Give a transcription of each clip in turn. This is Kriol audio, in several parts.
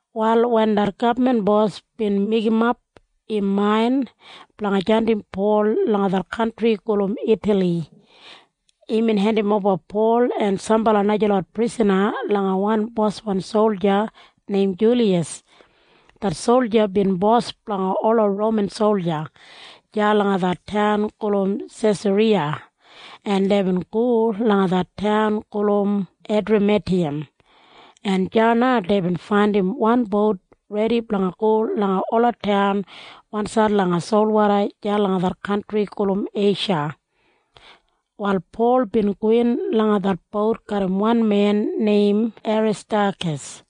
Wal wen det gabman bos bin meigimap im main blanga jandim Pol langa det kantri gulum Itali, imbin hendimoba Pol en sambala najalot prisana langa wan boswan solja neim Juliyas. Det solja bin bos blanga ola Roman solja deya langa det taun gulum Sesariya, en deibin go langa det taun gulum Edramitiyam, en deya na deibin faindim wan bout redi blanga go langa ola taun wansaid langa solwoda deya langa det kantri gulum Eisha. Wal Pol bin gowin langa det bout garram wan men neim Aristakas.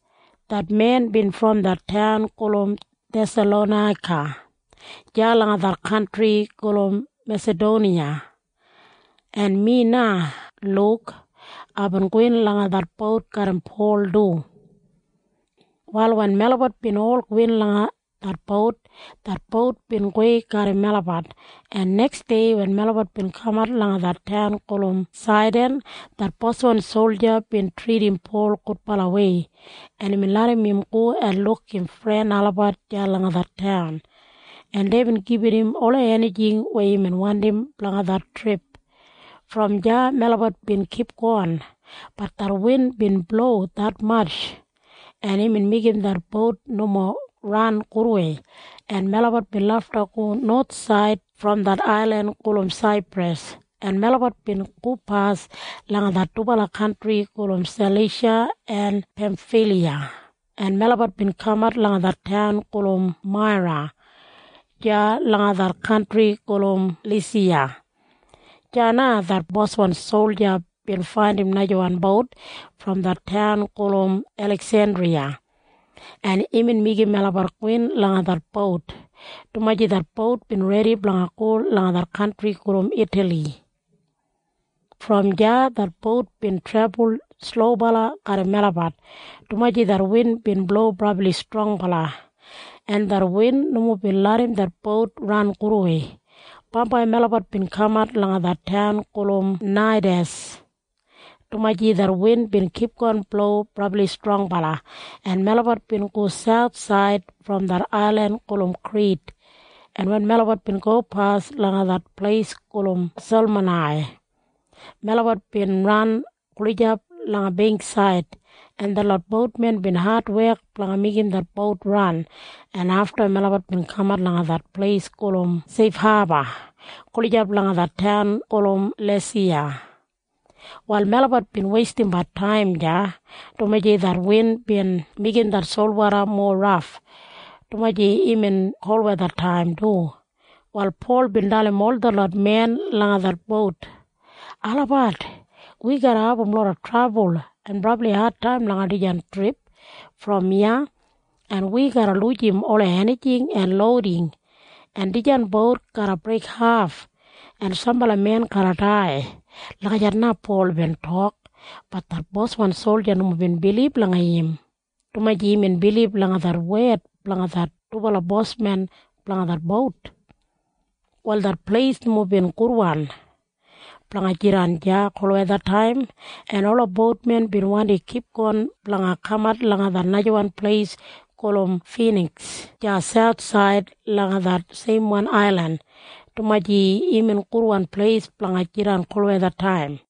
Det men bin brom det taun gulum Thesalonaika deya langa det kantri gulum Mesadoniya. En mi na, Luk, aibin gowin langa det bout garram Pol du. Wal wen melabat bin ol gowin langa det bout, det bout bin gowei garram melabat, en neksdei wen melabat bin kamat langa det taun gulum Saidan, det boswan solja bin tridim Pol gudbalawei, en imbin larram im go en luk im fren olabat deya langa det taun, en deibin gibit im ola enijing weya imbin wandim blanga det trip. Brom deya melabat bin kipgon. Bat det win bin blo detmatj, en imbin meigim det bout nomo ran gudwei, en melabat bin lafta go nowathsaid brom det ailin gulum Saipras, en melabat bin gopas langa det dubala kantri gulum Salisha en Pemfiliya, en melabat bin kamat langa det taun gulum Maira deya langa det kantri gulum Lisiya. Deya na det boswan solja bin faindim najawan bout brom det taun gulum Eliksendriya, en imbin meigim melabat gowin langa det bout, dumaji det bout bin redi blanga go langa det kantri gulum Itali. Brom deya det bout bin trebul slobala garram melabat, dumaji det win bin blo brabli strongbala, en det win nomo bin larram det bout ran gudwei. Bambai melabat bin kamat langa det taun gulum Naidas, dumaji det win bin kipgon blo brabli strongbala, en melabat bin go sauthsaid brom det ailin gulum Krit, en wen melabat bin gopas langa det pleis gulum Selmonai, melabat bin ran gulijap langa beingksaid, en detlot boutmen bin adwek blanga meigim det bout ran, en afta melabat bin kamat langa det pleis gulum Seifhaba gulijap langa det taun gulum Lasiya. Wal melabat bin weistimbat taim deya, dumaji det win bin meigim det solwoda mowa raf, dumaji imbin kolwethataim du, wal Pol bin dalim ol detlot men langa det bout. “Olabat, wi garra abum loda trabul en brabli adtaim langa dijan trip brom iya, en wi garra lujim ola enijing en louding, en dijan bout garra breikhaf, en sambala men garra dai.” Lagijat na Pol bin tok. Bat det boswan solja nomo bin bilib langa im, dumaji imbin bilib langa det wed blanga det dubala boswan blanga det bout. Wal det pleis nomo bin gudwan blanga jidan deya kolwethataim, en ola boutmen bin wandi kipgon blanga kamat langa det najawan pleis gulum Finiks deya sauthsaid langa det seimwan ailin, dumaji imbin gudwan pleis blanga jidan kolwethataim.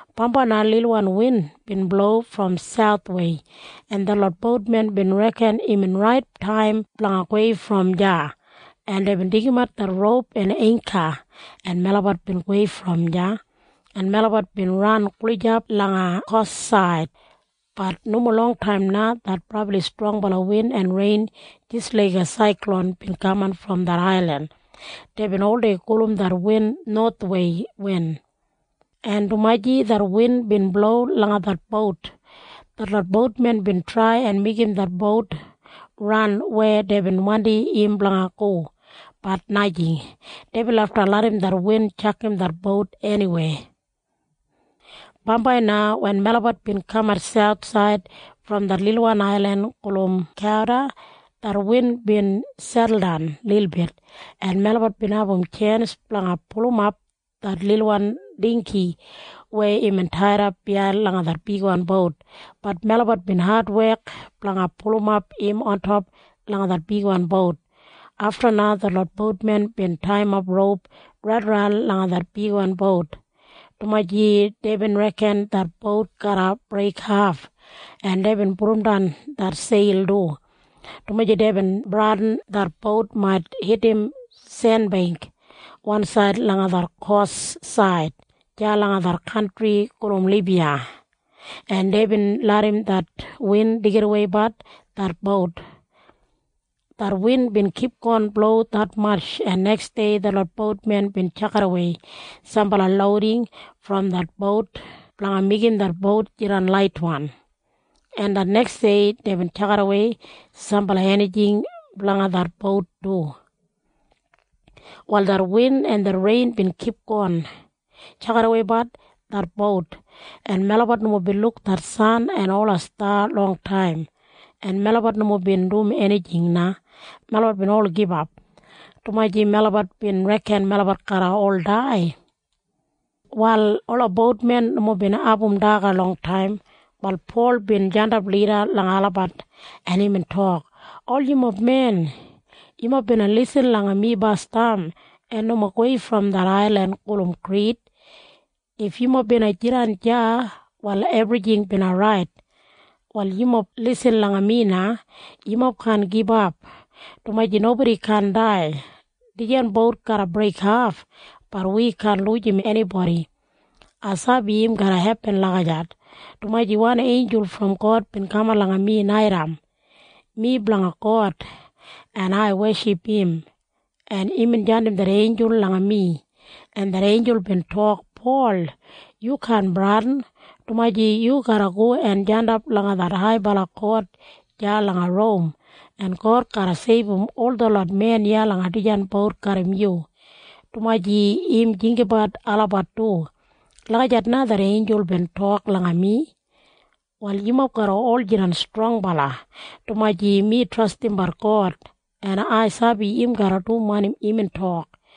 Bambai na lilwan win bin blo brom sauthwei, en detlot boutmen bin reken imbin rait taim blanga gowei brom deya, en deibin deigimat det roup en eingka, en melabat bin gowei brom deya, en melabat bin ran gulijap langa kous said. Bat nomo longtaim na det brabli strongbala win en rein jis laiga saiklon bin kaman brom det ailin. Deibin oldei gulum det win Nowathwei Win. En dumaji det win bin blo langa det bout, detlot boutmen bin trai en meigim det bout ran weya deibin wandim im blanga go. Bat najing. Deibin lafta larram det win tjakam det bout eniwei. Bambai na wen melabat bin kamat sauthsaid brom det lilwan ailin gulum Kauda, det win bin seduldan lilbit, en melabat bin abum tjens blanga pulumap det lilwan dinggi weya imbin taidap biyain langa det bigwan bout. Bat melabat bin adwek blanga pulumap im ontop langa det bigwan bout. Afta na detlot boutmen bin taiyimap roup raidaran langa det bigwan bout, dumaji deibin reken det bout garra breikhaf, en deibin pudumdan det seil du, dumaji deibin bradin det bout mait hitim senbeingk wansaid langa det kous said deya langa det kantri gulum Libiya, en deibin larram det win deigidaweibat det bout. Det win bin kipgon blo detmatj, en neksdei detlot boutmen bin tjakidawei sambala louding brom det bout blanga meigim det bout jidan laitwan, en det neksdei deibin tjakidawei sambala enijing blanga det bout du. Wal det win en rein bin kipgon tjakidaweibat det bout, en melabat nomo bin luk det san en ola sta maitbi dubala wik, en melabat nomo bin dum enijing na. Melabat bin ol gibap, dumaji melabat bin reken melabat garra ol dai. Wal ola boutmen nomo bin abum daga longtaim, wal Pol bin jandap lida langa olabat, en imbin tok, “Ol yumob men, yumob bina lisin langa mi basdam en nomo gowei brom det ailin gulum Krit. If yumob bina jidan deya, wal ebrijing bina rait. “Wal yumob lisin langa mi na. Yumob kaan gibap, dumaji nobodi kaan dai. Dijan bout garra breikhaf. Bat wi kaan lujim enibodi. Ai sabi im garra hepin lagijat, dumaji wan einjul brom God bin kaman langa mi naitaim. Mi blanga God, en ai weship im, en imbin jandim det einjul langa mi, en det einjul bin tok, ‘Pol, yu kaan bradin, dumaji yu garra go en jandap langa det haibala kot deya langa Rom, en God garra seibum ol detlot men iya langa dijan bout garram yu, dumaji im jinggabat olabat du.’ Lagijat na det einjul bin tok langa mi. “Wal yumob garra ol jidan strongbala, dumaji mi trastim God, en ai sabi im garra dum wanim imbin tok.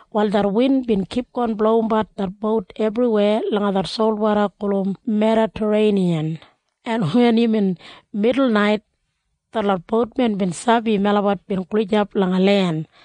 Wal det win bin kipgon blowimbat det bout ebriweya langa det solwoda gulum Medatareiniyan, en wen imbin midulnait, detlot boutmen bin sabi melabat bin gulijap langa len,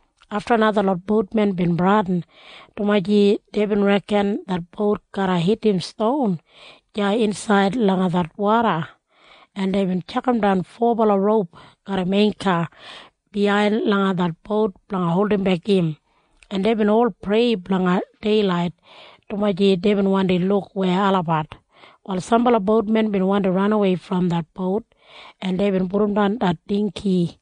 Afta na detlot boutmen bin bradin, dumaji deibin reken det bout garra hitim ston deya insaid langa det woda, en deibin tjakamdan fobala roup garram eingka biyain langa det bout blanga holdimbek im, en deibin ol prei blanga deilait, dumaji deibin wandi luk weya olabat. Wal sambala boutmen bin wandi ranawei brom det bout, en deibin pudumdan det dinggi,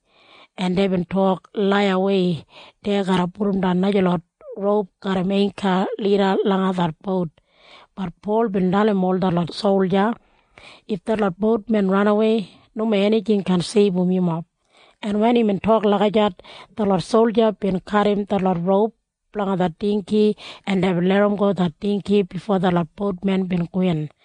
en deibin tok laiyawei dei garra pudumdan najalot roup garram eingka lida langa det bout. Bat Pol bin dalim ol detlot solja, “If detlot boutmen ranawei, nomo enijing kaan seibum yumob.” En wen imbin tok lagijat, detlot solja bin kadim detlot roup blanga det dinggi, en deibin larramgo det dinggi bifo detlot boutmen bin gowin.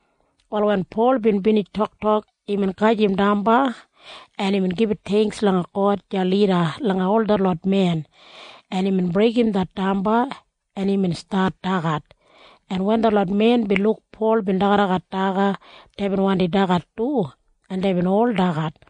Wal wen Pol bin binij toktok, imbin gajim damba, en imbin gibit theingks langa God deya lida langa ol detlot men, en imbin breigim det damba, en imbin stat dagat, en wen detlot men bin luk Pol bin dagadagat daga, deibin wandi dagat du, en deibin ol dagat.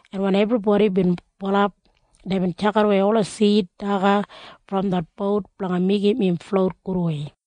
en wen ebribodi bin bulap, deibin tjakidawei ola sid daga brom det bout blanga meigim im flout gudwei.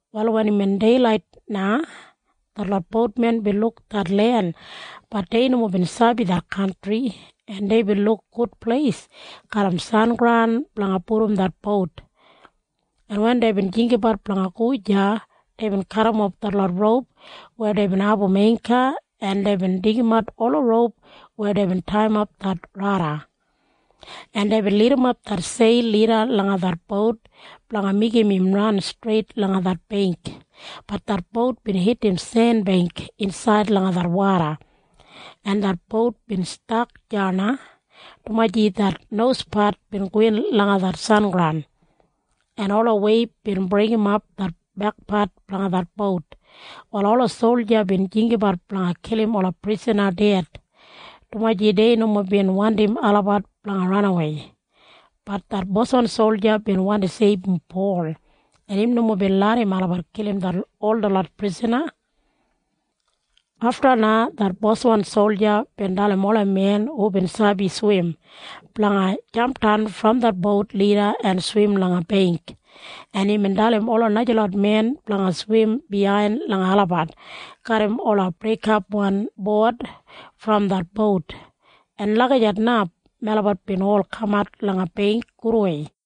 Wal wen imbin deilait na, detlot boutmen bin luk det len. Bat dei nomo bin sabi det kantri, en deibin luk gud pleis garram sengraun blanga pudum det bout, en wen deibin jinggabat blanga go deya, deibin kadimof detlot roup weya deibin abum eingka, en deibin deigimat ola roup weya deibin taiyimap det rada, en deibin lidimap det seil lida langa det bout blanga meigim im ran streit langa det beingk. Bat det bout bin hitim senbeingk insaid langa det woda, en det bout bin stak deya na, dumaji det nospat bin gowin langa det sengraun, en ola weib bin breigimap det bekpat blanga det bout. Wal ola solja bin jinggabat blanga kilim ola prisana ded, dumaji dei nomo bin wandim olabat blanga ranawei. Bat det boswan solja bin wandi seibum Pol, en im nomo bin larram olabat kilim ol detlot prisana. Afta na det boswan solja bin dalim ola men hubin sabi swim blanga jampdan brom det bout lida en swim langa beingk, en imbin dalim ola najalot men blanga swim biyain langa olabat garram ola breikapwan bowad brom det bout, en lagijat na melabat bin ol kamat langa beingk gudwei.